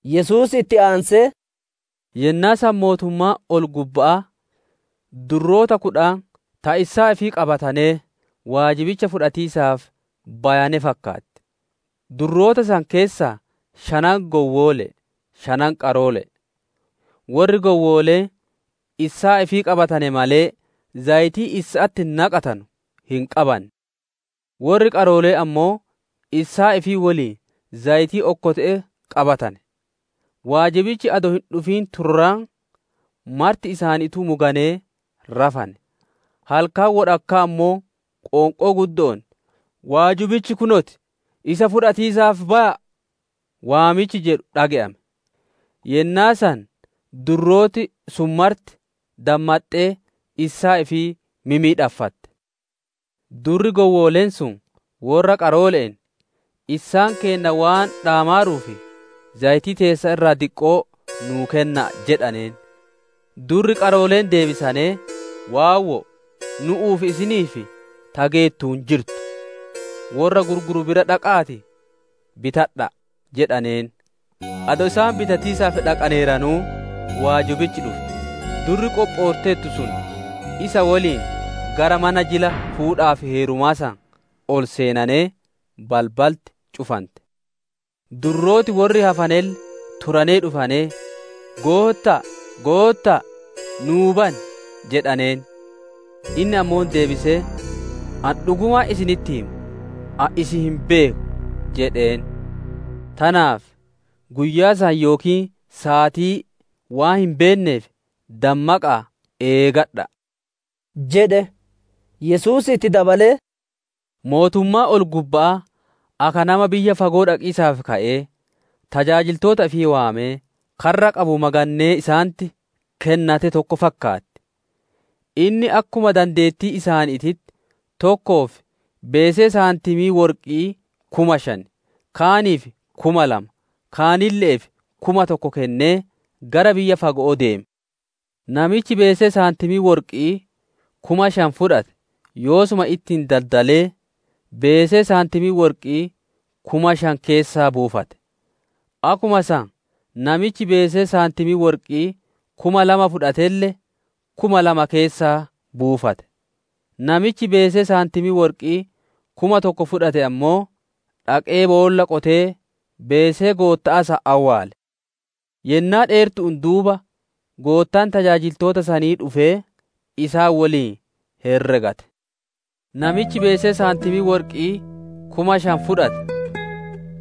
Yesuus itti aansee, «Yennaa san mootummaan ol-gubba'aa durroota kudhan ta issaa ifii qabatanee waajibicha fudhatiisaaf bayane fakkaatti. Durroota san keessaa shanan gowwoole'e, shanan qaroole'e. Worri gowwooleen issaa ifii qabatane malee zayitii issa'atti naqatanu hin qabanne. Worri qarooleen ammoo issaa ifii woliin zayitii okkote'etti qabatane. Waajibichi adoo hin dhufin turraan, marti isaaniituu muganee rafane. «Halkan wodhakkaa ammoo qoonqoo guddo'oon, ‹Waajibichi Kunoo ti! Isa fudhatiisaaf baya'a!› waamichi jedhu dhage'ame. Yennaa san durrooti sun marti dammaxxee issaa ifii mimmidhaaffatte. Durri gowwooleen sun worra qaroole'een, ‹Issaan keenna waan dhaamaaruuf, zayitii teessan irraa diqqoo nuu kenna'a› jedhaneen. Durri qarooleen deebisanee, ‹Waawwo'o! Nu'uu fi isiniif ta geettu hin jirtu. Worra gurguru bira dhaqa'aatii bitadha'a› jedhaneen. Adoo isaan bitatiisaaf dhaqaneeranuu, waajibichi dhufe; durri qophootteertu sun isa woliin gara mana jila fuudhaa fi heerumaa san ol seenanee, balbalti cufante. «Durrooti worri hafanelle turanee dhufanee, ‹Gootta'a, Gootta'a! Nuu bani!› jedhaneen. Inni ammoo deebisee, ‹Ani dhugumaan isinitti hima, ani isin hin beeku› jedheen. Tanaaf, guyyaa san yookiin saatii waan hin beenneef dammaqa'aa eegadha'a!» jedhe. Yesuus itti dabalee, «Mootummaan ol-gubba'aa akka nama biyya fago'oo dhaqiisaaf ka'ee, tajaajiltoota ifii waamee, karra qabu magannee isaanitti kennate tokko fakkaatti; Inni akkuma dandeettii isaaniititti tokkoof beesee saantimii worqi'ii kuma shan, kaaniif kuma lama, kaanille'eef kuma tokko kennee gara biyya fago'oo deeme. Namichi beesee saantimii worqi'ii kuma shan fudhate yoosuma ittiin daddallee, beesee saantimii worqi'ii kuma shan keessaa buufate. Akkuma san, namichi beesee saantimii worqi'ii kuma lama fudhatelle kuma lama keessaa baafate. Namichi beesee saantimii worqi'ii kuma tokko fudhate ammoo, dhaqee boolla qotee beesee gootta'aa san awwaale. «Yennaa dheertu'uun duuba goottaan tajaajiltoota sanii dhufee isaan woliin herregate. Namichi beesee saantimii worqi'ii kuma shan fudhate,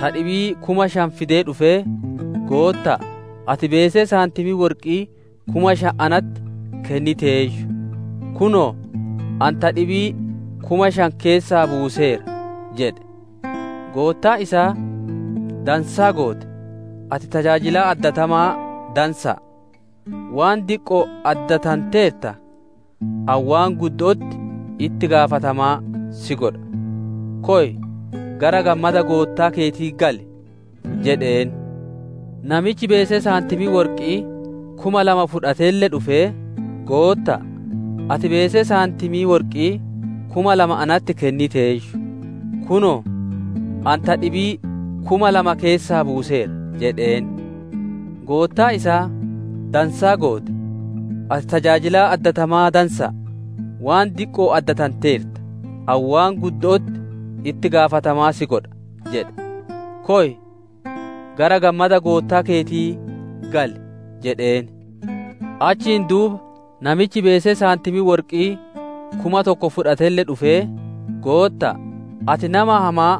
ta dhibii kuma shan fidee dhufee, ‹Gootta'a, ati beesee saantimii worqi'ii kuma shan natti kenniteeyyu; kunoo, ani ta dhibii kuma shan keessaa buuseera› jedhe. Goottaan isaa, ‹Dansaa goote, ati tajaajilaa addatamaa dansa'a; waan diqqo'oon addatanteerta, ani waan guddo'otti itti gaafatamaa si godha; koy gara gammada goottaa keetii gali!› jedheen. Namichi beesee saantimii worqi'ii kuma lama fudhatelle dhufee, ‹Gootta'a› jedhee, ‹Ati beesee saantimii worqi'ii kuma lama natti kenniteeyyu; kunoo, ani ta dhibii kuma lama keessaa buuseera› jedheen. Goottaan isaa, ‹Dansaa goote, ati tajaajilaa addatamaa dansa'a; waan diqqo'oon addatanteerta, ani waan guddo'otti itti gaafatamaa si godha; koy gara gammada goottaa keetii gali!› jedheen. Achiin duuba namichi beesee saantimii worqi'ii kuma tokko fudhatelle dhufee, ‹Gootta'a, ati nama hamaa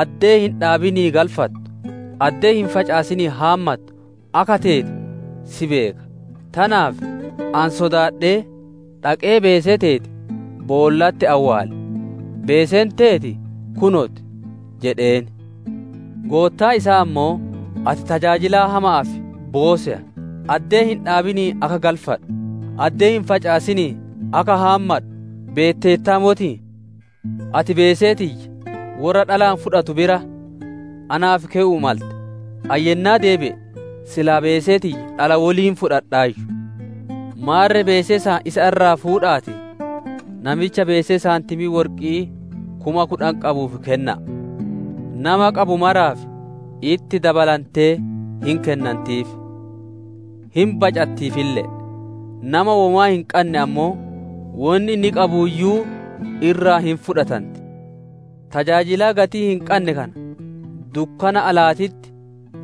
addee hin dhaabinii galfattu, addee hin facaasinii haammattu akka teete si beeka; tanaaf ani sodaadhee, dhaqee beesee teeti boollatti awwaale. Beeseen teeti kunoo ti› jedheen. «Goottaan isaa ammoo, ‹Ati tajaajilaa hama'aa fi booseya! Addee hin dhaabinii akka galfadhu, addee hin facaasinii akka haammadhu beetteertaa motii? Ati beesee tiyya worra dhalaan fudhatu bira naaf kewu'uu malte; ani yennaa deebi'e silaa beesee tiyya dhala woliin fudhadhaayyu. Maarre beesee san isa irraa fuudha'aatii, namicha beesee saantimii worqi'ii kuma kudhan qabuuf kenna'a. Nama qabu maraaf itti dabalantee hin kennantiif, hin bacattiifille'e; nama womaa hin qanne ammoo, wonni inni qabuuyyuu irraa hin fudhatanti. Tajaajilaa gatii hin qanne kana, dukkana alaatitti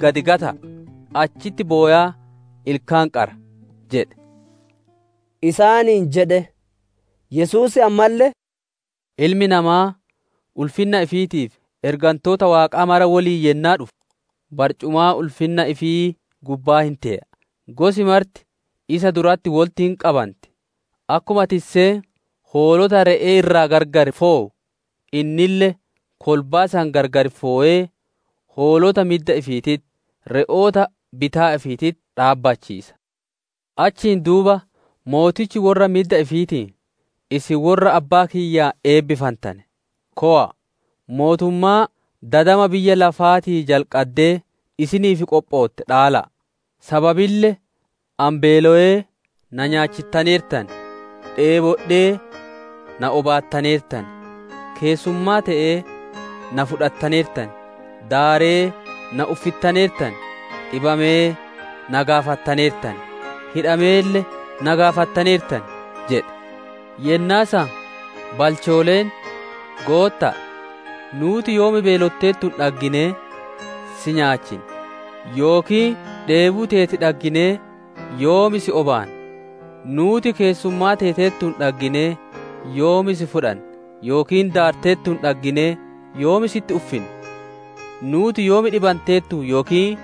gad gata'a, achitti bowaa ilkaan qara› jedhe» isaaniin jedhe. Yesuus ammalle, «Ilmi Namaa ulfinna ifiitii fi ergantoota Waaqaa mara woliin yennaa dhufu, barcumaa ulfinna ifii gubbaa hin tee'a. Gosi marti isa duratti wolitti hin qabanti; akkuma tisseen hoolota re'ee irraa gargar fowu, innille kolbaa san gargar fowee, hoolota midda ifiititti, re'oota bitaa ifiititti dhaabbachiisa. Achiin duuba mootichi worra midda ifiitiin, ‹Isin worra Abbaa kiyyaan eebbifantane, kowa'a! Mootummaa dadama biyyi lafaatii jalqaddee isiniif qophootte dhaala'a; sababille ani beelowee na nyaachittaneertan; dheebodhee na obaattaneertan; keessummaa te'ee na fudhattaneertan; daaree na uffittaneertan; dhibamee na gaafattaneertan; hidhameelle na gaafattaneertan› jedhe. Yennaa san balchooleen, ‹Gootta'a, nuuti yoom beelotteertuun dhagginee si nyaachinne? Yookiin dheebuu teeti dhagginee yoom si obaanne? « ‹Nuuti keessummaa teeteertuun dhagginee yoom si fudhanne, yookiin daarteertuun dhagginee yoom sitti uffinne? Nuuti yoom dhibanteertuun yookiin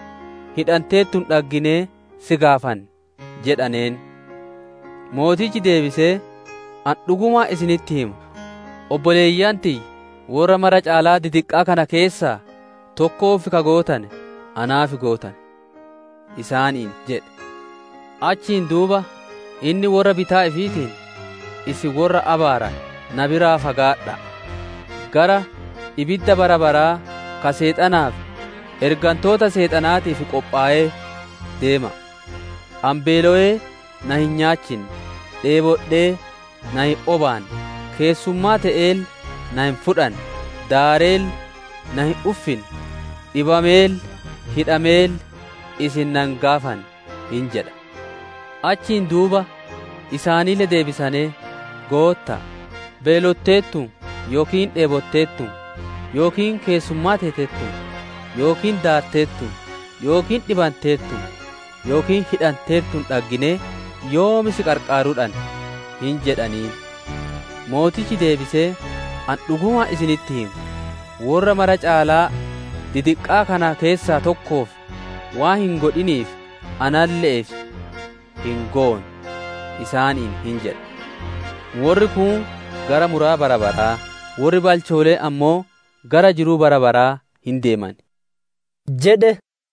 hidhanteertuun dhagginee si gaafanne?› jedhaneen. Mootichi deebisee, ‹Ani dhugumaan isinitti hima, obboleeyyan tiyya worra mara caalaa didiqqa'aa kana keessaa tokkoof ka gootane, naaf gootane!› isaaniin jedhe. «Achiin duuba inni worra bitaa ifiitiin, ‹Isin worra abaarame na biraa fagaadha'a; gara ibidda bara baraa ka Seexanaa fi ergantoota Seexanaatiif qophowee deema'a; ani beelowee na hin nyaachinne; dheebodhee na hin obaanne; keessummaa te'eelle na hin fudhanne; daareelle na hin uffinne; dhibameelle, hidhameelle isin na hin gaafanne› hin jedha. «Achiin duuba isaanille deebisanee, ‹Gootta'a, beelotteertuun, yookiin dheebotteertuun, yookiin keessummaa teeteertuun, yookiin daarteertuun, yookiin dhibanteertuun, yookiin hidhanteertuun dhagginee yoom si qarqaaruu dhanne?› hin jedhaniin. Mootichi deebisee, ‹Ani dhugumaan isinitti hima, worra mara caalaa didiqqa'aa kana keessaa tokkoof waan hin godhiniif, analle'eef hin goone› isaaniin hin jedha. Worri kun gara muraa bara baraa, worri balchooleen ammoo gara jiruu bara baraa hin deeman» jedhe.